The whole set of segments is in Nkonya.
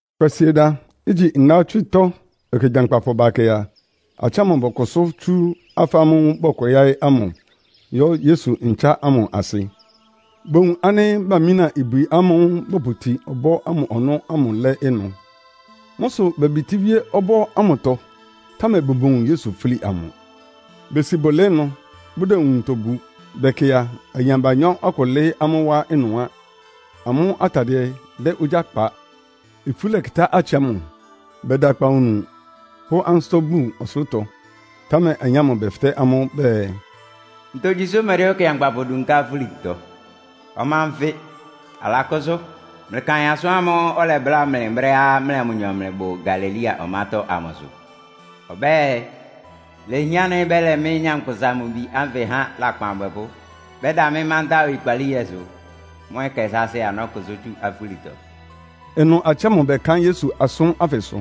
Kwasieda, igyi ndawɔ́tswɩ́tɔ́ ɛkɛ gyankpapʋ bakɛ a, atsɩ ámʋ bɔkʋsʋ́ tsú afá ámʋ́ʋ́ bɔkwɛ yáɩ́ ámʋ yɔ́ Yesu ntsán ámʋ asɩ. Bowun ánɩ́ bamína ibwi ámʋ́ʋ́ bɔpʋtin ɔbɔ́ ámʋ ɔnɔ́ ámʋ lɛ́ ɩnʋ. Mʋ́ sʋ bebitíwíé ɔbɔ́ ámʋtɔ, támɛ bʋmowun Yesu fúli amʋ. Besi bʋlɩɩ́, bʋdɛ nwuntɔ bu. Bɛkɩ a, ayin abanyɔ́ akʋ lɩ́ɩ́ amʋ́ wá ɩnʋ á. Amʋ́ atadɩɛ dɛ ogyá kpa. Ifú lɛkɩtá atsɩ ámʋ, bɛda akpawunu pʋ́ ansɩ́tɔ́ bun ɔsʋlʋ́tɔ. Támɛ ayin ámʋ bɛfɩtɛ́ amʋ́ bɛɛ, “Ntogyi sʋ́ mlɩdɛ́ ɔkɩankpapʋ dunká afúlitɔ? Ɔma nfɩ, alakʋ́sʋ́! Mlɩkaɩn asʋ́n ámʋ́ʋ́ ɔlɛbláa mlɩ brɛ́á mlɩa mʋnyɔ mlɩbʋ Galilea ɔmátɔ́ ámʋsʋ. Ɔbɛ́ɛ, ‘Ilehián ánɩ́ bɛ́lɛ mɩ́, Nyankpʋsa-Mʋ-Bi ánfɩ há lakpan abwɛpʋ́. Bɛ́da mɩ́ mántá oyikpalíhɛsʋ. Mʋ́ ɛkɛ sáásɩ́ a, nɔ́kʋsʋ́ tsú afúlitɔ.’” Ɩnʋ atsɩ ámʋ bɛkaɩ́n Yesu asʋ́n ánfɩsʋ.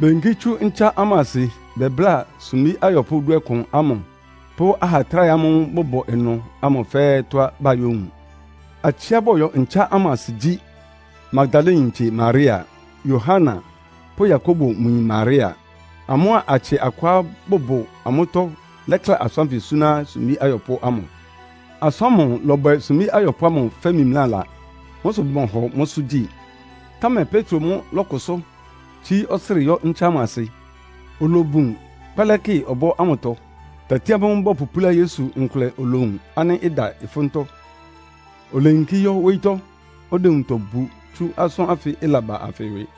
Beyinkí tsú ntsán ámʋ asɩ bɛbláa sumbí ayɔpʋ́ dúɔkʋn ámʋ pʋ́ aha atráhɛ amʋ́ʋ́ bʋbʋ ɩnʋ ámʋ fɛ́ɛ́ tɔ́á bayówun. Atsɩá bɔyɔ ntsán ámʋ asɩ gyí, Magdalayintse Maria, Yohana pʋ́ Yakobo mʋ yin Maria. Amʋ́a atsɩ akʋá bʋbʋ amʋ́tɔ́ lɛ́kla asʋ́n ánfɩ suná sumbí ayɔpʋ́ ámʋ. Asʋ́n ámʋ lɔbwɛ sumbí ayɔpʋ́ ámʋ fɛ́ mimlála. Mʋ́ sʋ bʋmɔhɔ mʋ́sʋ́ gyi. Támɛ Petro mʋ́ lɔ́kʋsʋ́, tsíí ɔsrɩ yɔ́ ntsán ámʋ asɩ. Olobun kpɛlɛ́kɩ ɔbɔ́ ámʋtɔ. Tati ámʋ́ʋ́ bɔpʋpúlá Yesu nkʋlɛ olowun ánɩ́ ɩda ɩfʋ́ntɔ́. Oleyinkí yɔ́ wóyítɔ́, ɔdɛ nwuntɔ bu tsú asʋ́n ánfɩ ɩlaba anfɩ ɩwɩ.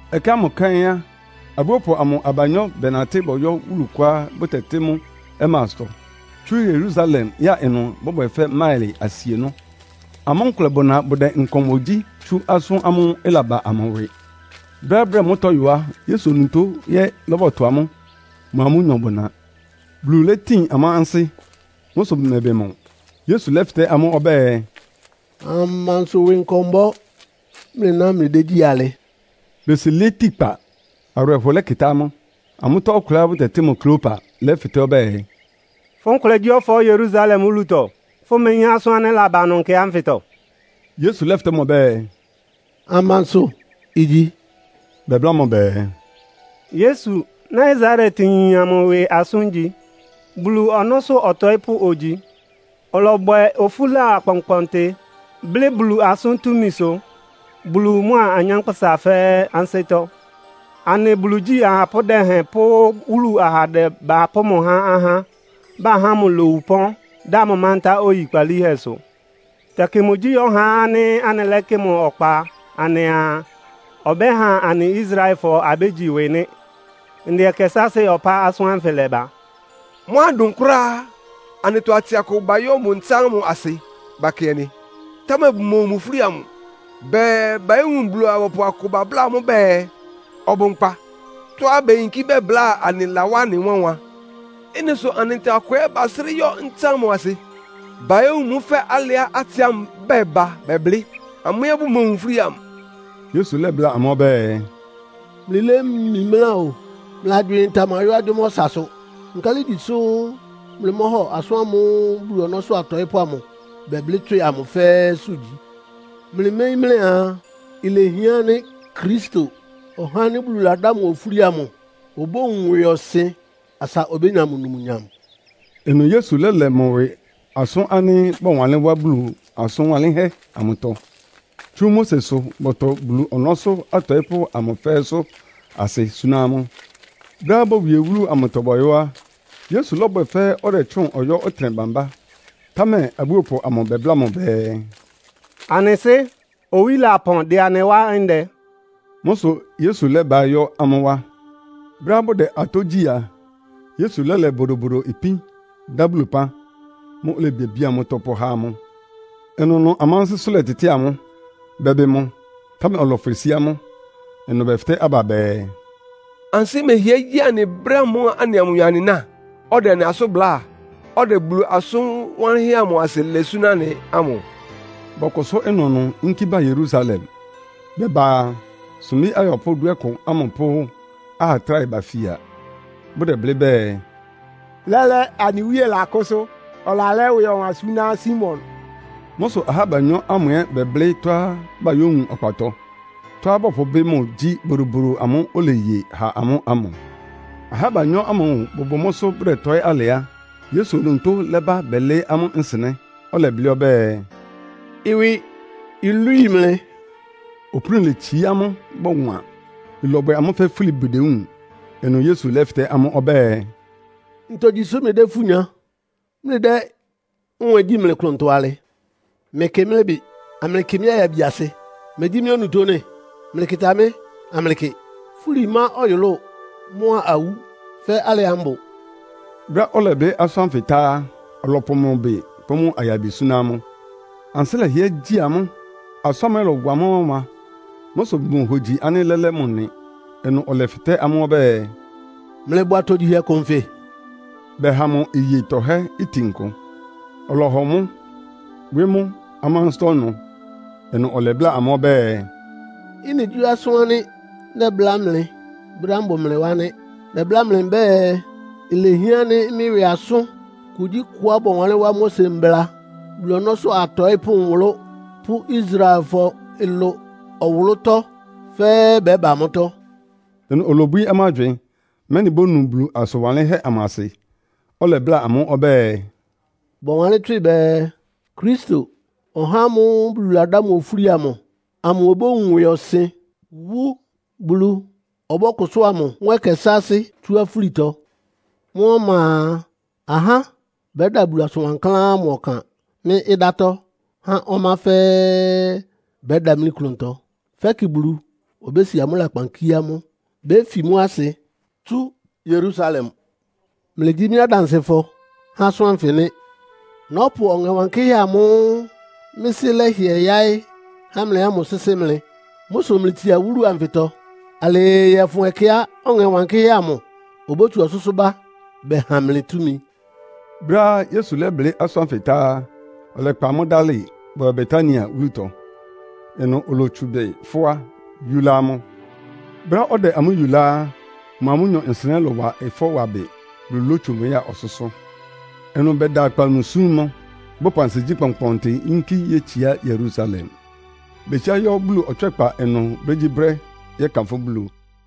Ɛkɛ ámʋ kɛ́n á, abúopʋ amʋ abanyɔ́ bɛnatɩ́ bɔyɔ́ wúlu kʋá bʋtɛtɩ́ mʋ́ Emaustɔ. Tsú Yerusalem ya ɩnʋ bɔ́bwɛ fɛ́ máɩlɩ asienɔ́. Amʋ́ nkʋlɛ bʋna bʋdɛ nkɔmbɔ gyí tsu asʋ́n ámʋ́ʋ́ ɩlaba amʋ ɩwɩ. Brɛ́á bʋdɛ mʋ́tɔ́ yɔ á, Yesu onutó ɛ́ lɔ́bɔtʋ amʋ́, mʋa amʋ́nyɔ bʋna. Bulu létin amʋ́ ansɩ́. Mʋ́ sʋ bʋmɛbɩ mʋ. Yesu lɛ́fɩtɛ́ amʋ́ ɔbɛ́ɛ, “Amansʋ ɩwɩ nkɔmbɔ mlɩná mlɩdégyí alɩ?” Besi lɩɩ́ tikpa, awɩrɛhɔ lɛkɩtá amʋ́. Amʋ́tɔ́ ɔkʋlɛá bʋtɛtɩ́ mʋ Kleopa lɛ́fɩtɛ́ ɔbɛ́ɛ, “Fʋ́ nkʋlɛ gyí ɔfɔɔ́ Yerusalem wúlutɔ, fʋ́meyín asʋ́n ánɩ́ ɩlaba ɩnʋ nkɛ ánfɩtɔ?” Yesu lɛ́fɩtɛ́ mʋ ɔbɛ́ɛ, “Amansʋ igyi?” Bɛbláa mʋ bɛɛ, “Yesu, Nasaretyin amʋ ɩwɩ asʋ́n igyi. Bulu ɔnɔ́sʋ́ ɔtɔɩ́pʋ́ ogyi. Ɔlɔbwɛ ofúla akpɔnkpɔntɩ, blɩ́ Bulu asʋ́n túmisʋ, Bulu mʋa anyánkpʋ́sa fɛ́ɛ́ ansɩ́tɔ́. Anɩ Bulu igyí ahapʋ́ dɛhɛn pʋ́ wúlu ahandɛ bapʋ́ mʋ há ahá, bahá mʋ lowu ɩpɔ́n, dá mʋ mántá oyikpalíhɛsʋ. Tɛkɩ mʋgyí ɔhá ánɩ́ anɩlɛ́kɩ ɔkpa anɩaa, ɔbɛ́ha anɩ Israelfɔ abégyi ɩwɩ nɩ́. Ndɛ ɛkɛ sáásɩ́ ɔpá asʋ́n ánfɩ lɛ́bá. Mʋ́á ɩdʋn kʋ́ráá á, anɩtɔ atsɩ akʋ bayɔ́ mʋ ntsán ámʋ asɩ bakɩɛnɩ, támɛ bʋmowun mʋ fúli amʋ. Bɛɛ, bayówun Bulu-abɔpʋ akʋ babláa amʋ́ bɛɛ, ɔbʋ nkpa. Tɔ́á beyinkí bɛbláa anɩ lawá anɩ wánwan. Ɩ́nɩ sʋ anɩtɔ akʋ ɛ́ basrɩ́ yɔ́ ntsán ámʋ asɩ, bayówun mʋ́ fɛ́ alɩá atsɩ ámʋ bɛba bɛblɩ́. Amʋ́ ɛ́ bʋmowun fúli amʋ.” Yesu lɛ́bláa amʋ́ ɔbɛ́ɛ, “Mlɩlémimlá o! Mlɩ agywɩɩn tamayɔ́ agyʋ́má ɔsasʋ. Nkálɩ igyi sʋ́ mlɩmɔ́hɔ asʋ́n ámʋ́ʋ́ Bulu ɔnɔ́sʋ́ atɔɩ́pʋ́ amʋ bɛblɩ́ tswɩ amʋ fɛ́ɛ́sʋ́ gyi? Mlɩméyín mlɩaa, ilehián ánɩ́ Kristo, (ɔhá ánɩ́ Bulu ladá mʋ ofúli amʋ) obówun ɩwɩɔsɩn, asa obénya mʋ numnyam?” Ɩnʋ Yesu lɛ́lɛ mʋ ɩwɩ asʋ́n ánɩ́ bɔwanlɩ́n wá Bulu asʋn wanlɩ́nhɛ́ amʋtɔ, tsú Mosesʋ bɔtʋ Bulu ɔnɔ́sʋ́ atɔɩ́pʋ́ amʋ fɛ́ɛ́sʋ́ asɩ súná amʋ́. Brɛ́á bowie wúlu amʋtɔ bɔyɔ́ á, Yesu lɔ́bwɛ fɛ́ ɔdɛtsʋ́ʋn ɔyɔ́ ɔtɩnɛ bambá. Támɛ abúopʋ amʋ bɛbláa mʋ bɛɛ, “Anɩ sɩ́, owí lapɔn, dɩ anɩ wá ndɛ.” Mʋ́ sʋ Yesu lɛ́baɩ́ yɔ́ amʋ́ wá. Brɛ́á bʋdɛ atɔ́ gyí a, Yesu lɛ́lɛ bodobodo ipín, dá Bulu ɩpán. Mʋ́ʋ́ olebiabía mʋ́tɔ́ pʋ́há amʋ́. Ɩnʋnʋ amʋ́ ansɩ́sʋ́ lɛtɩtɩ́ɩ amʋ́, bɛbɩ mʋ, támɛ ɔlɔfwɩ sí amʋ́. Ɩnʋ bɛfɩtɛ́ aba bɛɛ, “Ansɩ́ mɛhɩɛ gyí anɩ brɛ́ ámʋ́ʋ́ anɩa mʋnyɔ anɩná, ɔdɛ anɩ asʋ́n bláa, ɔdɛ Bulu asʋn wanlɩ́nhɛ́ amʋ asɩ lɛ súná anɩ ámʋ?” Bɔkʋsʋ́ ɩnʋnʋ yínkí ba Yerusalem. Bɛba a, sumbí ayɔpʋ́ dúɔkʋn ámʋ pʋ́ aha tráhɛ bafia, bʋ́dɛblɩ́ bɛɛ, “Lɛ́lɛ́, anɩ Wíe lakʋ́sʋ́. Alalɛ́ ɩwɩ ɔwan súná Simon!” Mʋ́ sʋ ahá abanyɔ́ ámʋ ɛ́ bɛblɩ́ tɔ́á bayówun ɔkpatɔ. Tɔ́á bɔpʋbɩ́ mʋ gyí bodobodo amʋ́ʋ́ oleye ha amʋ́ ámʋ. Ahá abanyɔ́ ámʋ bʋbʋ mʋ́sʋ́ bʋdɛtɔɩ́ alɩ á, Yesu onutó lɛ́ba bɛlɩɩ́ amʋ́ nsɩnɛ́. Ɔlɛblɩ́ ɔbɛ́ɛ, “Ɩwɩ ilwíi mlɩ.” Opúni letsií amʋ́, bɔwan. Ɩlɔbwɛ amʋ́ fɛ́ fúli bʋdewúun. Ɩnʋ Yesu lɛ́fɩtɛ́ amʋ́ ɔbɛ́ɛ, “Ntogyi sʋ́ mlɩdɛ́ ifú nya, mlɩdɛ́ nwɛ́ɛn gyí mlɩ klʋntɔ alɩ? Mlɩkɩ mɩ́ ɩbɩ, amlɩkɩ mɩ́ ayabiasɩ. Megyí mɩ́ onutó nɩ́? Mlɩkɩta mɩ́ amlɩkɩ. Fúli má ɔyʋlʋ́ʋ mʋ́a awú fɛ́ alɩá mbʋ.” Brɛ́á ɔlɛblɩ́ asʋ́n ánfɩ tá á, ɔlɔpʋ mʋ ɩbɩ pʋ́ mʋ ayabi súná amʋ́. Ansɩ́ lɛhɩɛ gyi amʋ́, asʋ́n ámʋ ɛ́ lɔ́wa amʋ́ wánwan. Mʋ́ sʋ bʋmohogyi ánɩ́ lɛ́lɛ́ mʋ nɩ. Ɩnʋ ɔlɛfɩtɛ́ amʋ́ ɔbɛ́ɛ, “Mlɩbʋ atogyihɛ kʋ nfɩ?” Bɛha mʋ iye tɔhɛ́ itin kʋ, ɔlɔhɔ mʋ́, wɩ́ mʋ́ amʋ́ ansɩ́tɔ́ ɩnʋ. Ɩnʋ ɔlɛbláa amʋ́ ɔbɛ́ɛ, “Ɩ́nɩ gyí asʋ́n ánɩ́ nɛbláa mlɩ brɛ́á mbʋ mlɩ wá nɩ́. Nɛbláa mlɩ mbɛ́ɛ, ilehián ánɩ́ mɩ́ ɩwɩ asʋ́n kugyíkʋá bɔwanlɩ́n wá Mose Mbla, Bulu ɔnɔ́sʋ́ atɔɩ́pʋ́ nwʋlʋ́ pʋ́ Israelfɔ ɩlʋ ɔwʋlʋ́tɔ́ fɛ́ɛ́ bɛ́ba mʋ́tɔ́.” Ɩnʋ olobwií amʋ́ agywɩɩn, mɛ́nɩ bónu Bulu asʋn wanlɩ́nhɛ́ amʋ asɩ. Ɔlɛbláa amʋ́ ɔbɛ́ɛ, “Bɔwanlɩ́n tswɩ bɛɛ, Kristo, (ɔhá ámʋ́ʋ́ Bulu ladá mʋ ofúli amʋ) amʋ obówun ɩwɩɔsɩn, wú. Bulu ɔbɔ́kʋsʋ́a mʋ mʋ́ ɛkɛ sáásɩ́ tsú afúlitɔ. Mʋ́ ɔma a, ahá bɛ́da Bulu asʋn wankláán ámʋ ɔkan mɩ́ ɩdátɔ́ há ɔmá fɛ́ɛ́ bɛɛ bʋdámli klʋntɔ, fɛ́kɩ Bulu obési amʋ́ lakpan kíé amʋ́. Béfi mʋ́ asɩ tsú Yerusalem. Mlɩgyí mɩ́ adansɩfɔ há asʋ́n ánfɩ nɩ́. Nɔ́pʋ Ɔŋɛ Wankɩ́hɛ́ amʋ́ʋ́ mɩ́ Sɩ́ lɛ́hɩɛ yáɩ́ há mlɩ ámʋ sɩ́sɩ́ mlɩ. Mʋ́ sʋ mlɩtsia wúlu anfɩtɔ alɩɩ yɔ́fʋn ɛkɛá Ɔŋɛ Wankɩ́hɛ́ amʋ obótsu ɔsʋ́sʋ́ bá bɛha mlɩ túmi.” Brɛ́á Yesu lɛ́blɩ́ asʋ́n ánfɩ tá á, ɔlɛkpa amʋ́ dálɩ, bɔyɔ Betania wúlutɔ. Ɩnʋ olotsu ɩbɩ fʋ́á, yúlá amʋ́. Brɛ́á ɔdɛ amʋ́ yulá á, mʋa amʋ́nyɔ nsɩnɛ́ lɔ́wa ɩfɔ́ wa bɩ, Bulu lótsu mʋ ya ɔsʋ́sʋ́. Ɩnʋ bɛda akpawunu súm mʋ, bɔpʋ ansigyí kpɔnkpɔntɩ yínkí yétsiá Yerusalem. Betsiá yɔ́ Bulu ɔtswɛ́kpa ɩnʋ brégyíbrɛ́, yɛ́kanfʋ́ Bulu.